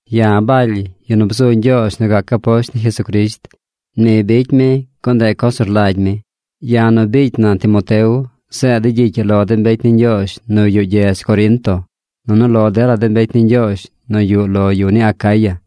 Ya̱ Baly, yu nu bzu Ñgyoozh nu gac aposht ni Jesucrisht. Ni bicy mi, gun ndeꞌ coz nu rlagy mi. Ya̱ nu biicy na Timoteo zeed de̱ gyicy ii lo de mbecy ni Ñgyoozh nu yuꞌ gyedz Corinto nunu lo dela de mbecy ni Ñgyoozh nu yuꞌ lo de yu ni Acaya.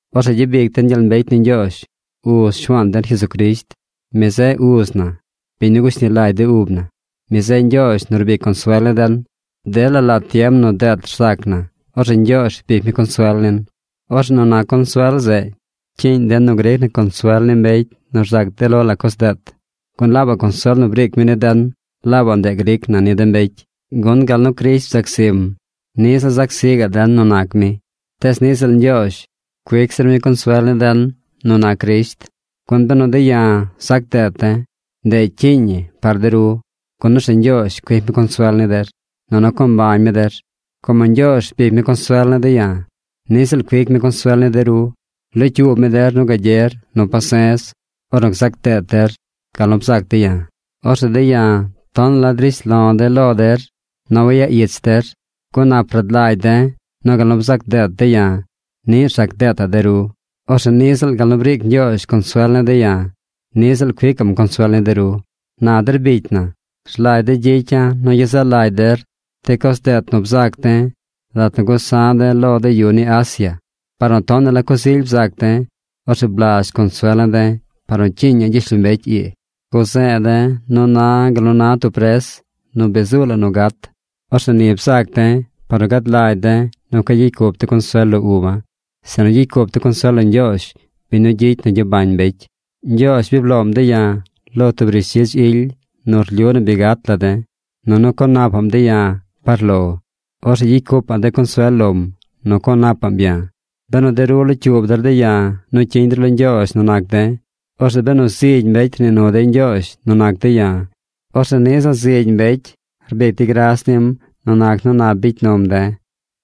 Orzeꞌ gyabic den gyel mbecy ni Ñgyoozh, Uz Shuaan den Jesucrisht. Mi zeꞌ Uz na, biñ nu gushni lagy de ub na. Mi zeꞌ Ñgyoozh nu rbic consuel ni den. Dela lat tiem nu deet rzac na, orzeꞌ Ñgyoozh rbic mi consuel nin. Orzeꞌ nu nac consuel zeꞌ cyiiñ den nu gric na consuel ni mbecy nu rzac de lo la coz deet. Gun laabaꞌ consuel nu briic mi ni den, laabaꞌ ndeꞌ gric na ni de mbecy. Gun gal nu Crisht bzac zim, niꞌ ziꞌl zac zi gaꞌ den nu nac mi. Tees niꞌ ziꞌl Ñgyoozh cuic zir mi consuel ni den nu nac Crisht. Gun benu de̱ ya̱ zac deet de̱, ndeꞌ cyiiñ ñi par de ru, gun orzeꞌ Ñgyoozh cuic mi consuel ni der, nunu co mbañ mi der. Como Ñgyoozh rbic mi consuel ne̱ de̱ ya̱, niꞌ ziꞌl cuic mi consuel ni de ru. Locyuub mi der nu gagyer nu pase̱z ornu gzac deet der gal nu bzac de̱ ya̱. Orzeꞌ de̱ ya̱ tonaꞌ la drish lo̱ de̱ lo der nu wayaꞌ ich der, gun nap rad lagy de̱ nu gal nu bzac deet de̱ ya̱, niꞌ rzac deetaꞌ de ru. Orzeꞌ niꞌ ziꞌl gal nu briic Ñgyoozh consuel ni de̱ ya̱, niꞌ ziꞌl cuicaꞌm consuel ni de ru. Na der bicy na, rlagy de̱ gyicya̱ nu gyezaꞌ lagy der de coz deet nu bzaac de̱ lat nu gusa̱ de̱ lo de yu ni Asia. Par nu tonaꞌ la coz ily bzac de̱, orzeꞌ blazh consuel ne̱ de̱ par nu cyiiña̱ gyishlombecy ii. Guze̱e̱ de̱ nu na̱ gal nu na tub pres nu bi zuu la nu gat. Orzeꞌ ni bzac de̱ par nu gad lagy de̱ nu cueꞌ gyicy cup de̱ consuel lo uba̱, sinu gyicy cup de̱ consuel lo Ñgyoozh, biñ nu gyicy nu gyabañ mbecy. Ñgyoozh bi bloom de̱ ya̱ lo tub rishdzidz ily nu rlyu nu bi gat la de̱, nunu co napaꞌm de̱ ya̱ par lo. Orzeꞌ gyicy cupaꞌ de̱ consuel lom nu co napaꞌm ya̱, benu de ru locyuub der de̱ ya̱ nu cyiñ der lo Ñgyoozh nu nac de̱. Orzeꞌ benu zigy mbecy rnii nu dey Ñgyoozh nu nac de̱ ya̱, orzeꞌ niꞌ ziꞌl zigy mbecy rbic dey gras nim nu nac nu nap bicy num de̱.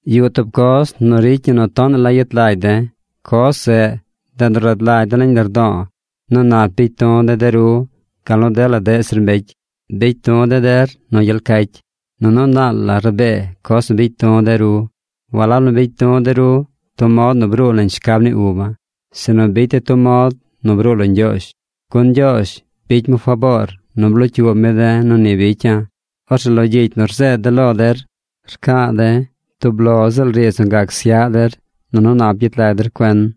Yuꞌ tub coz nu ricy ñi nu tonaꞌ la yet lagy de̱. Coz zeꞌ, ndeꞌ nu rad lagy de̱ nañ lardo̱o̱ nu nap bicy du̱ de̱ de ru gal nu dela deꞌ zir mbecy. Bicy du̱ de̱ der nu gyel cacy. Nunu naal la rabee coz nu bicy du̱ de ru. Walab nu bicy du̱ de ru tub mod nu bruu nañ shcab ni uba̱, sinu bicy de̱ tub mod nu bruu lo Ñgyoozh. Gun Ñgyoozh bicy mi faboor nu blocyuub mi de̱ nu ni bicya̱. Orzeꞌ lo gyicy nu rzeed de̱ lo der rca̱a̱ de̱ tub lo ziꞌl riidz nu gac syaꞌ der nunu nap gyet lag der cuen.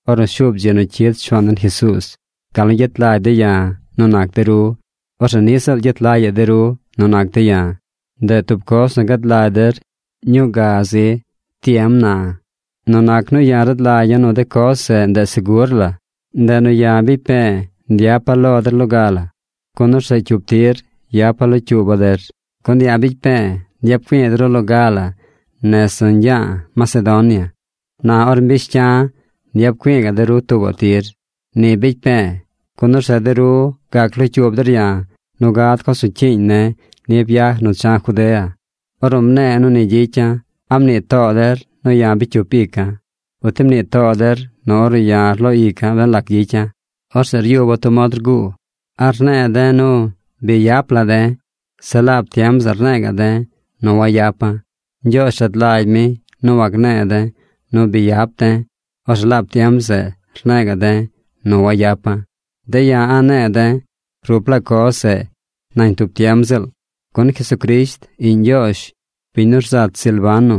ornu shuub dzi nu cyid Shuaan den Jesuuz, gal nu gyet lagy de̱ ya̱ nu nac de ru, orzeꞌ niꞌ ziꞌl gyet lagyaꞌ de ru nu nac de̱ ya̱. Ndeꞌ tub coz nu gad lagy der ñuu ga zi tiem na. Nu nac nu ya̱ rad lagya̱ nu de coz zeꞌ ndeꞌ segur la, ndeꞌ nu ya̱ bicy pe̱e̱ nyapa̱ lo der loga la, gun orzeꞌ cyup tir yapa̱ locyuuba̱ der. Gun ya̱ bicy pe̱e̱ nyap güi̱i̱ de ru loga la nez nu ñgya̱a̱ Macedonia. Na or mbish cya̱, nyap güi̱i̱ ga̱ꞌ de ru tuubaꞌ tir. Ni bicy pe̱e̱, gun orzeꞌ de ru gac locyuub der ya̱ nu gad coz nu cyiiñ ne̱ ni byaj nu cha̱ Judea. Ornu mne̱e̱ nu ni gyicya̱, ¿a mnii too der nu ya̱ bicy cyup ica̱? ¿Uti mnii too der nu ornu ya̱ rloo ica̱ ben lac gyicya̱, orzeꞌ ryuba̱ tub mod rguu? ¿A rne̱e̱ de̱ nu “Bi yap la de̱”, zeꞌ laab tiem zeꞌ rne̱e̱ ga̱ꞌ de̱ nu “Wayapa̱?” Ñgyoozh rad lagy mi nu wagne̱e̱ de̱ nu “Bi yap de̱”, orzeꞌ laab tiem zeꞌ rne̱e̱ ga̱ de̱ nu “Wayapa̱.” De̱ ya̱ a̱ꞌ ne̱e̱ de̱ rup laa coz zeꞌ nañ tub tiem ziꞌl. Gun Jesucrisht, Iꞌñ Ñgyoozh, biñ nu rzat Silvano,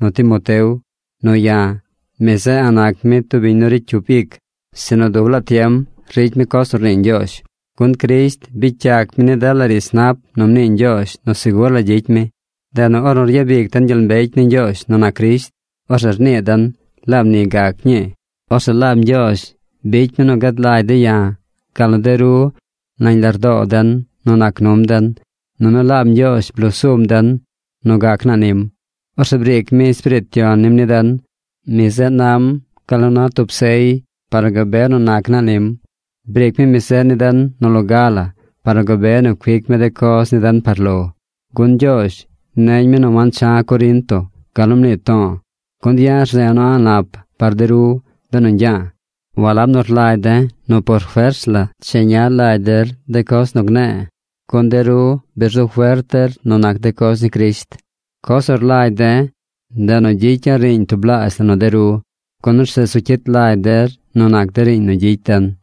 nu Timoteo, nu ya̱, mi zeꞌ a̱ꞌ nac mi tub biñ nu ricy cyup ic, sinu dub laa tiem ricy mi coz nu rnii Ñgyoozh. Gun Crisht bicy yac mi ni dela riidz nap nu mnii Ñgyoozh nu segur la gyicy mi. Ndeꞌ nu ornu ryabic den gyel mbecy ni Ñgyoozh nu nac Crisht, orzeꞌ rnii den: “Laab ni gac ñii.” Orzeꞌ laab Ñgyoozh bicy mi nu gad lagy de̱ ya̱, gal nu de ru nañ lardoo den nu nac num den, nunu laab Ñgyoozh bloo sum den nu gac naa nim. Orzeꞌ briic mi Espiriit Yon nim ni den. Mi zeꞌ nam gal nu na tub sey par nu gabe nu nac naa nim. Briic mi mi zeꞌ ni den nu loga la par nu gabe nu cuic mi de coz ni den par lo. Gun Ñgyoozh neñ mi nu wancha̱ Corinto gal nu mnii to̱o̱ gun ya̱ rze̱e̱ nu a̱ꞌ nap par de ru benu ñgya̱a̱. Walab nu rlagy de̱ nu por fers la cheña lagy der de coz nu gne̱e̱, gun de ru bi rzu fert der nu nac de coz ni Crisht. Coz nu rlagy de̱, ndeꞌ nu gyicya̱ riiñ tublaazh la nu de ru, gun orzeꞌ zu cyit lagy der nu nac de riiñ nu gyicy den.